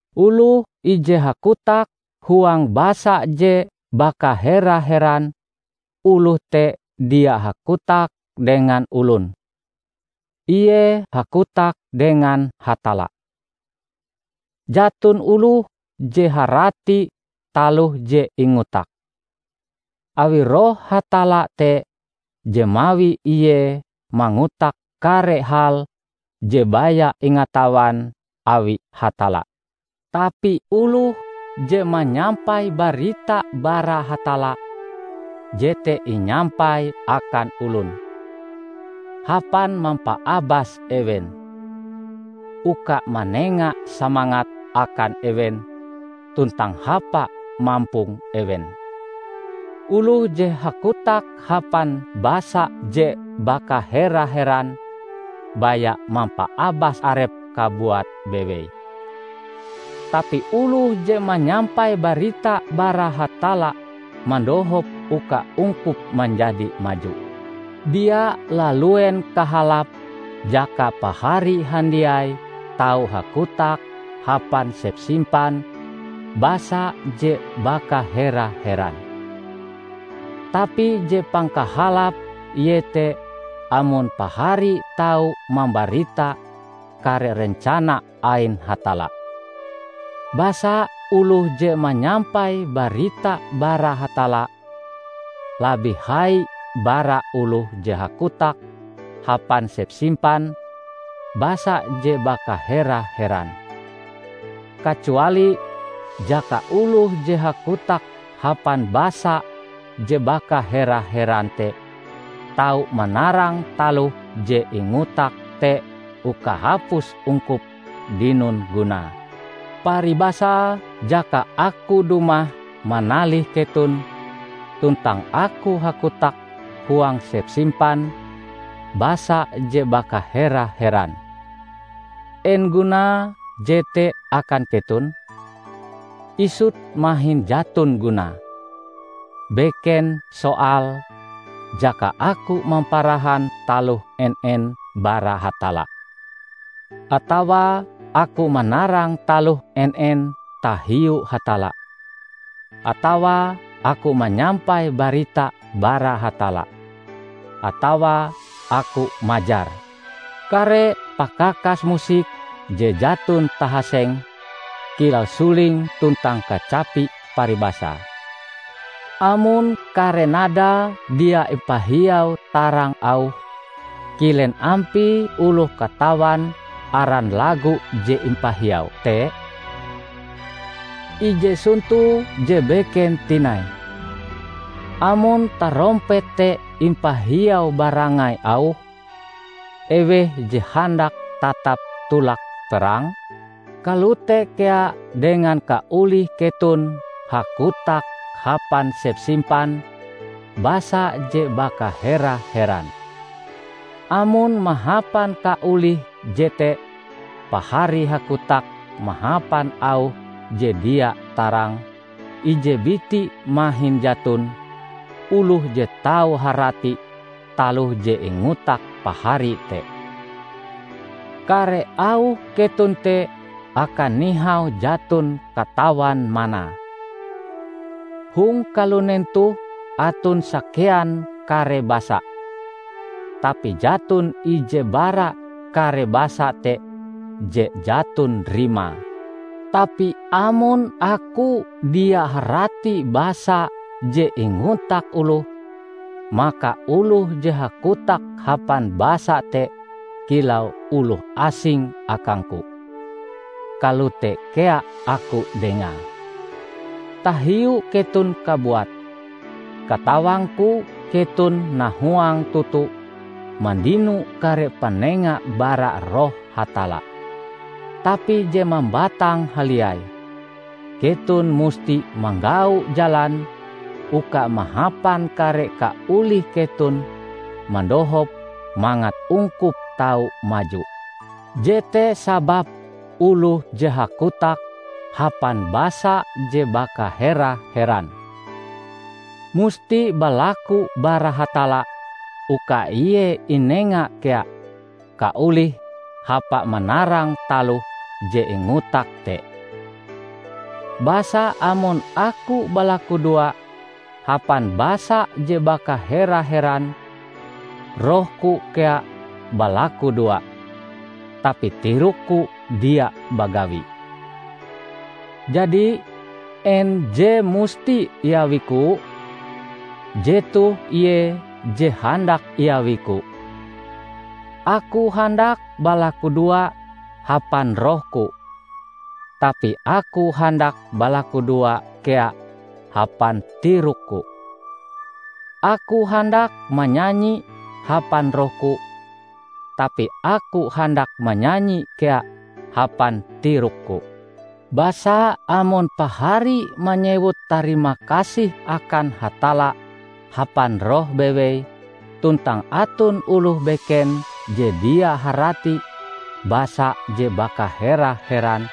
Oloh ije hakotak huang basa je bakahera-heran, oloh te dia hakotak dengan olon; ie hakotak dengan Hatalla. Jaton oloh je harati taloh je ingotake, awi Roh Hatalla te je mawi ie mangotak kare hal je baya ingatawan awi Hatalla. Tapi oloh je manyampai barita bara Hatalla, jete inyampaie akan olon; hapan mampaabas ewen, uka manenga semangat akan ewen tuntang hapa mampong ewen. Oloh je hakotak hapan basa je bakahera-heran baya mampaabas arepe kabuat bewei, tapi oloh je manyampai barita bara Hatalla mandohop uka ungkup manjadi maju. Dia laluen kahalape jaka pahari handiai tau hakotak hapan sepsimpan basa je bakahera-heran. Tapi je pangkahalape iete amon pahari tau mambarita kare rencana ain Hatalla. Basa oloh je manyampai barita bara Hatalla, labih hai bara oloh je hakotak hapan sepsimpan basa je bakahera-heran; kacuali jaka oloh je hakotak hapan basa je bakahera-heran te tau manarang taloh je ingotake te uka hapus ungkup dinon gunae. Paribasae jaka aku dumah manalih keton tuntang aku hakotak huang sepsimpan basa je bakahera-heran, en gunae jete akan keton? Isut mahin jaton gunae! Beken soale jaka aku mamparahan taloh en-en bara Hatalla, atawa aku manarang taloh en-en tahiu Hatalla, atawa aku manyampai barita bara Hatalla, atawa aku majar. Kare pakakas musik je jaton tahasenge, kilau suling tuntang kacapi paribasae, amon kare nadae dia impahiau tarang auhe, kilen ampie oloh katawan aran lagu je impahiaue te? Ije sonto je beken tinai: Amon tarompet te impahiau barangai auhe, eweh je handak tatap tolak perang? Kalote kea dengan kaolih keton hakotak hapan sepsimpan basa je bakahera-heran. Amon mahapan kaolih jete pahari hakotak mahapan auh je dia tarang, ije biti mahin jaton oloh je tau harati taloh je ingotak pahari te. Kare auh keton te akan nihau jaton katawan manae. Hong kalunen toh aton sakean kare basa, tapi jaton ije bara kare basa te je jaton rimae. Tapi amon aku dia harati basa je ingotak oloh, maka oloh je hakotak hapan basa te kilau oloh asing akangku; kalote kea aku dengae. Tahiu keton kabuat, katawangku keton nahuang toto mandino kare panenga bara Roh Hatalla. Tapi je mambatang haliai, keton musti manggau jalan uka mahapan kare kaolih keton mandohop mangat ungkup tau maju. Jete sababe oloh je hakotak hapan basa je bakahera-heran, musti balaku bara Hatalla uka ie inenga kea kaolih hapa manarang taloh je ingotake te. Basa amon aku balakudoa hapan basa je bakahera-heran, rohku kea balakudoa, tapi tirokku dia bagawi. Jadi, en je musti iawiku? Jetoh ie je handak iawiku: Aku handak balakudoa hapan rohku, tapi aku handak balakudoa kea hapan tirokku. Aku handak manyanyi hapan rohku, tapi aku handak manyanyi kea hapan tirokku. Basa amon pahari manyewut tarimakasih akan Hatalla hapan roh bewei, tuntang aton oloh beken je dia harati basa je bakahera-heran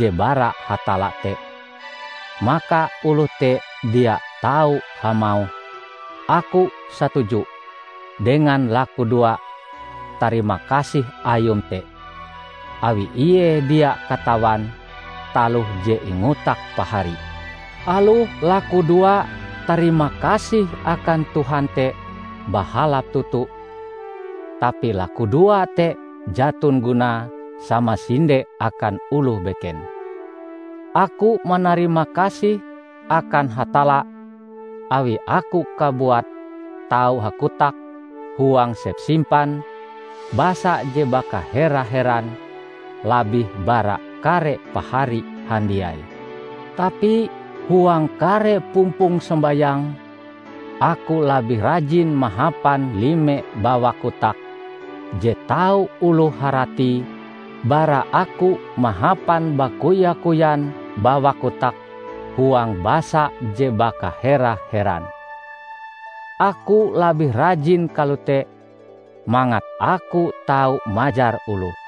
je bara Hatalla te, maka oloh te dia tau hamauh, "Aku satuju" dengan lakudoa tarimakasih ayum te; awi ie dia katawan taloh je ingotak pahari. Aloh lakudoa tarimakasih akan Tuhan te bahalap toto, tapi lakudoa te jaton gunae samasinde akan oloh beken. Aku manarimakasih akan Hatalla awi aku kabuat tau hakotak huang sepsimpan basa je bakahera-heran labih bara kare pahari handiai. Tapi, huang kare pumpong sombayang, aku labih rajin mahapan lime bawak kotak je tau oloh haratie bara aku mahapan bakoya-koyan bawak kotak huang basa je bakahera-heran. Aku labih rajin kalote mangat aku tau majar oloh.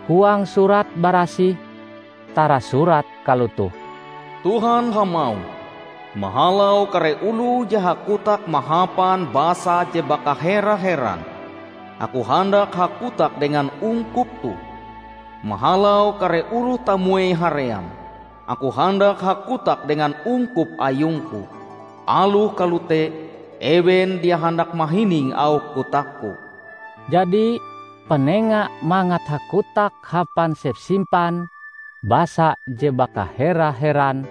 Huang Surat Barasih tarasurat kalotoh, "Tuhan hamauh, 'Mahalau kare oloh je hakotak mahapan basa je bakahera-heran, aku handak hakotak dengan ungkup toh. Mahalau kare oloh tamuei haream, aku handak hakotak dengan ungkup ayungku; aloh kalote, ewen dia handak mahining auh kotakku.' " Jadi panenga mangat hakotak hapan sepsimpan basa je bakahera-heran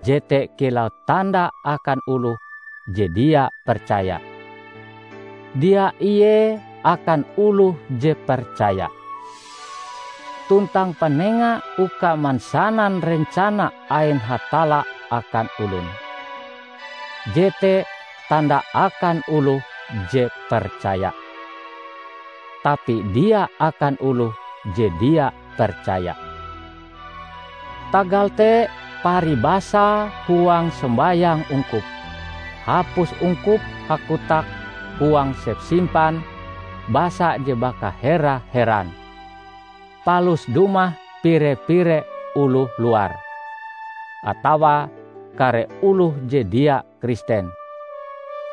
jete kilau tanda akan oloh je dia percaya, dia ie akan oloh je percaya. Tuntang panenga uka mansanan rencana ain Hatalla akan olon, jete tanda akan oloh je percaya, tapi dia akan oloh je dia percaya. Tagal te, paribasae huang sombayang ungkup, hapus ungkup hakotak huang sepsimpan basa je bakahera-heran, palus dumah pire-pire oloh luar, atawa kare oloh je dia Kristen,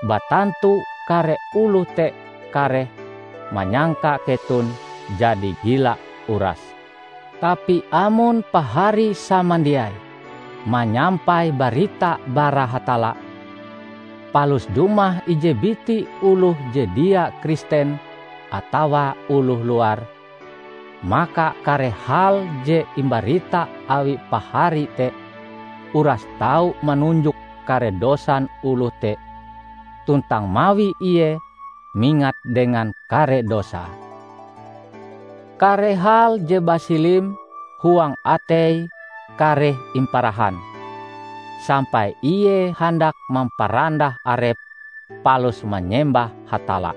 batantu kare oloh te kareh manyangka keton jadi gila urase! Tapi amon pahari samandiai manyampai barita bara Hatalla, palus dumah ije biti oloh je dia Kristen atawa oloh luar, maka kare hal je imbarita awi pahari te uras tau manunjuk kare dosan oloh te tuntang mawi ie mingat dengan kare dosae. Kare hal je basilim huang ateie kareh imparahan, sampai ie handak mamparandah arepe palus manyembah Hatalla.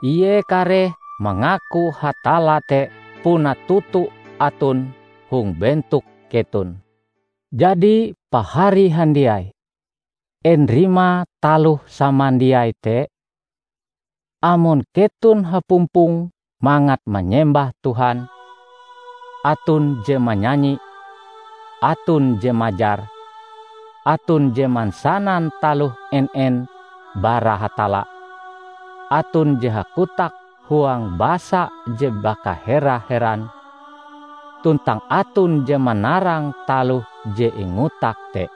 Ie kareh mangaku Hatalla te puna toto aton hong bentok keton. Jadi, pahari handiai, en rimae taloh samandiai te? Amon keton hapumpong mangat manyembah Tuhan, aton je manyanyi, aton je majar, aton je mansanan taloh en-en bara Hatalla, aton je hakotak huang basa je bakahera-heran, tuntang aton je manarang taloh je ingotak te.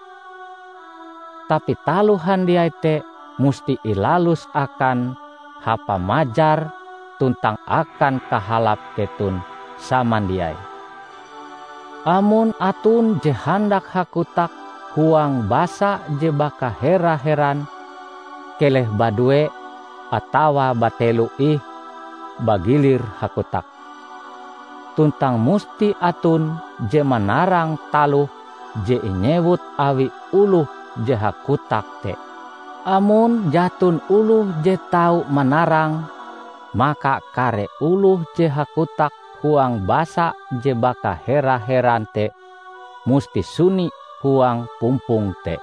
Tapi taloh handiai te musti ilalus akan hapa majar tuntang akan kahalap keton samandiai. Amon aton je handak hakotak huang basa je bakahera-heran, keleh badue atawa batelo ih bagilir hakotak. Tuntang musti aton je manarang taloh je inyewut awi oloh je hakotak te. Amon jaton oloh je tau manarange, maka kare oloh je hakotak huang basa je bakahera-heran te musti suni huang pumpong te.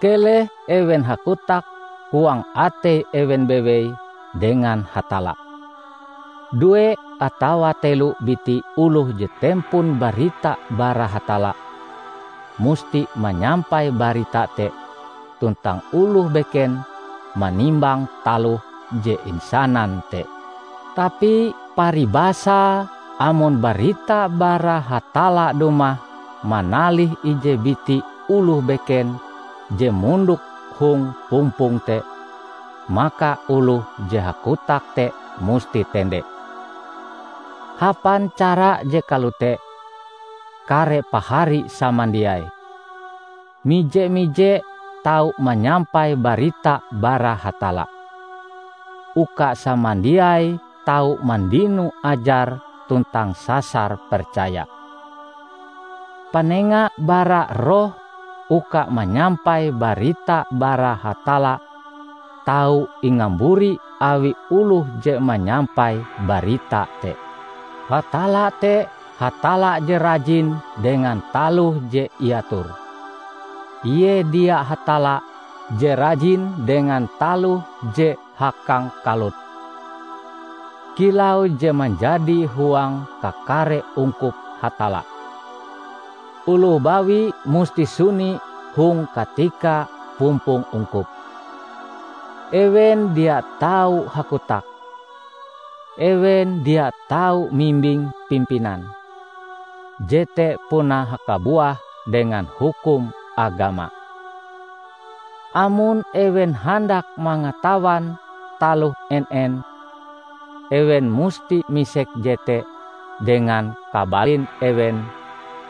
Keleh ewen hakotak huang atei ewen bewei dengan Hatalla. Due atawa telo biti oloh je tempon barita bara Hatalla, musti manyampai barita te tuntang oloh beken manimbang taloh je insanan te. Tapi paribasae amon barita bara Hatalla dumah manalih ije biti oloh beken je mondok hong pumpong te, maka oloh je hakotak te musti tende. Hapan cara je kalote, kare pahari samandiai, mije-mije tau manyampai barita bara Hatalla; uka samandiaie tau mandino ajar tuntang sasar percaya. Panenga bara Roh uka manyampai barita bara Hatalla tau ingamburi awi oloh je manyampai barita te. Hatalla te Hatalla je rajin dengan taloh je iator; ie dia Hatalla je rajin dengan taloh je hakangkalut. Kilau je manjadi huang kakare ungkup Hatalla, oloh bawi musti suni hong katika pumpong ungkup. Ewen dia tau hakotak. Ewen dia tau mimbing pimpinan; jete puna hakabuah dengan hukum agama. Amon ewen handak mangatawan taloh en-en, ewen musti misek jete dengan kabalin ewen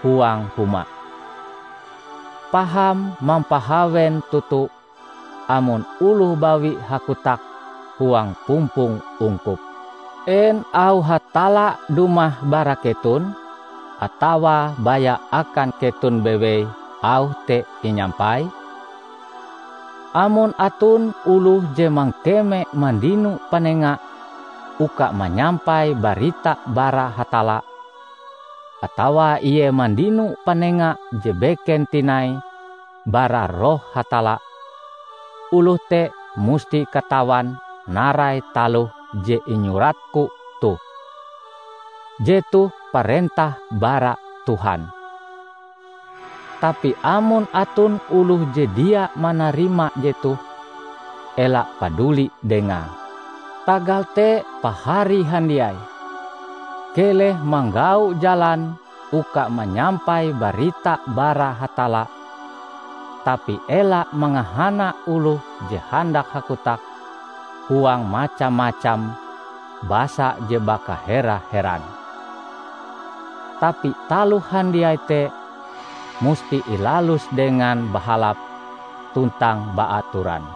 huang huma. Paham mampahawen toto amon oloh bawi hakotak huang pumpong ungkup. En auh Hatalla dumah bara keton? Atawa baya akan keton bewei auh te inyampai? Amon aton oloh je mangkeme mandino panenga uka manyampai barita bara Hatalla, atawa ie mandino panenga je beken tinai bara Roh Hatalla, oloh te musti katawan narai taloh je inyuratku toh, jetoh parentah bara Tuhan. Tapi amon aton oloh je dia manarima jetoh, ela paduli dengae. Tagal te pahari handiai, keleh manggau jalan uka manyampai barita bara Hatalla, tapi ela mangahana oloh je handak hakotak huang macam-macam basa je bakahera-heran. Tapi taloh handiai te musti ilalus dengan bahalap tuntang baatoran.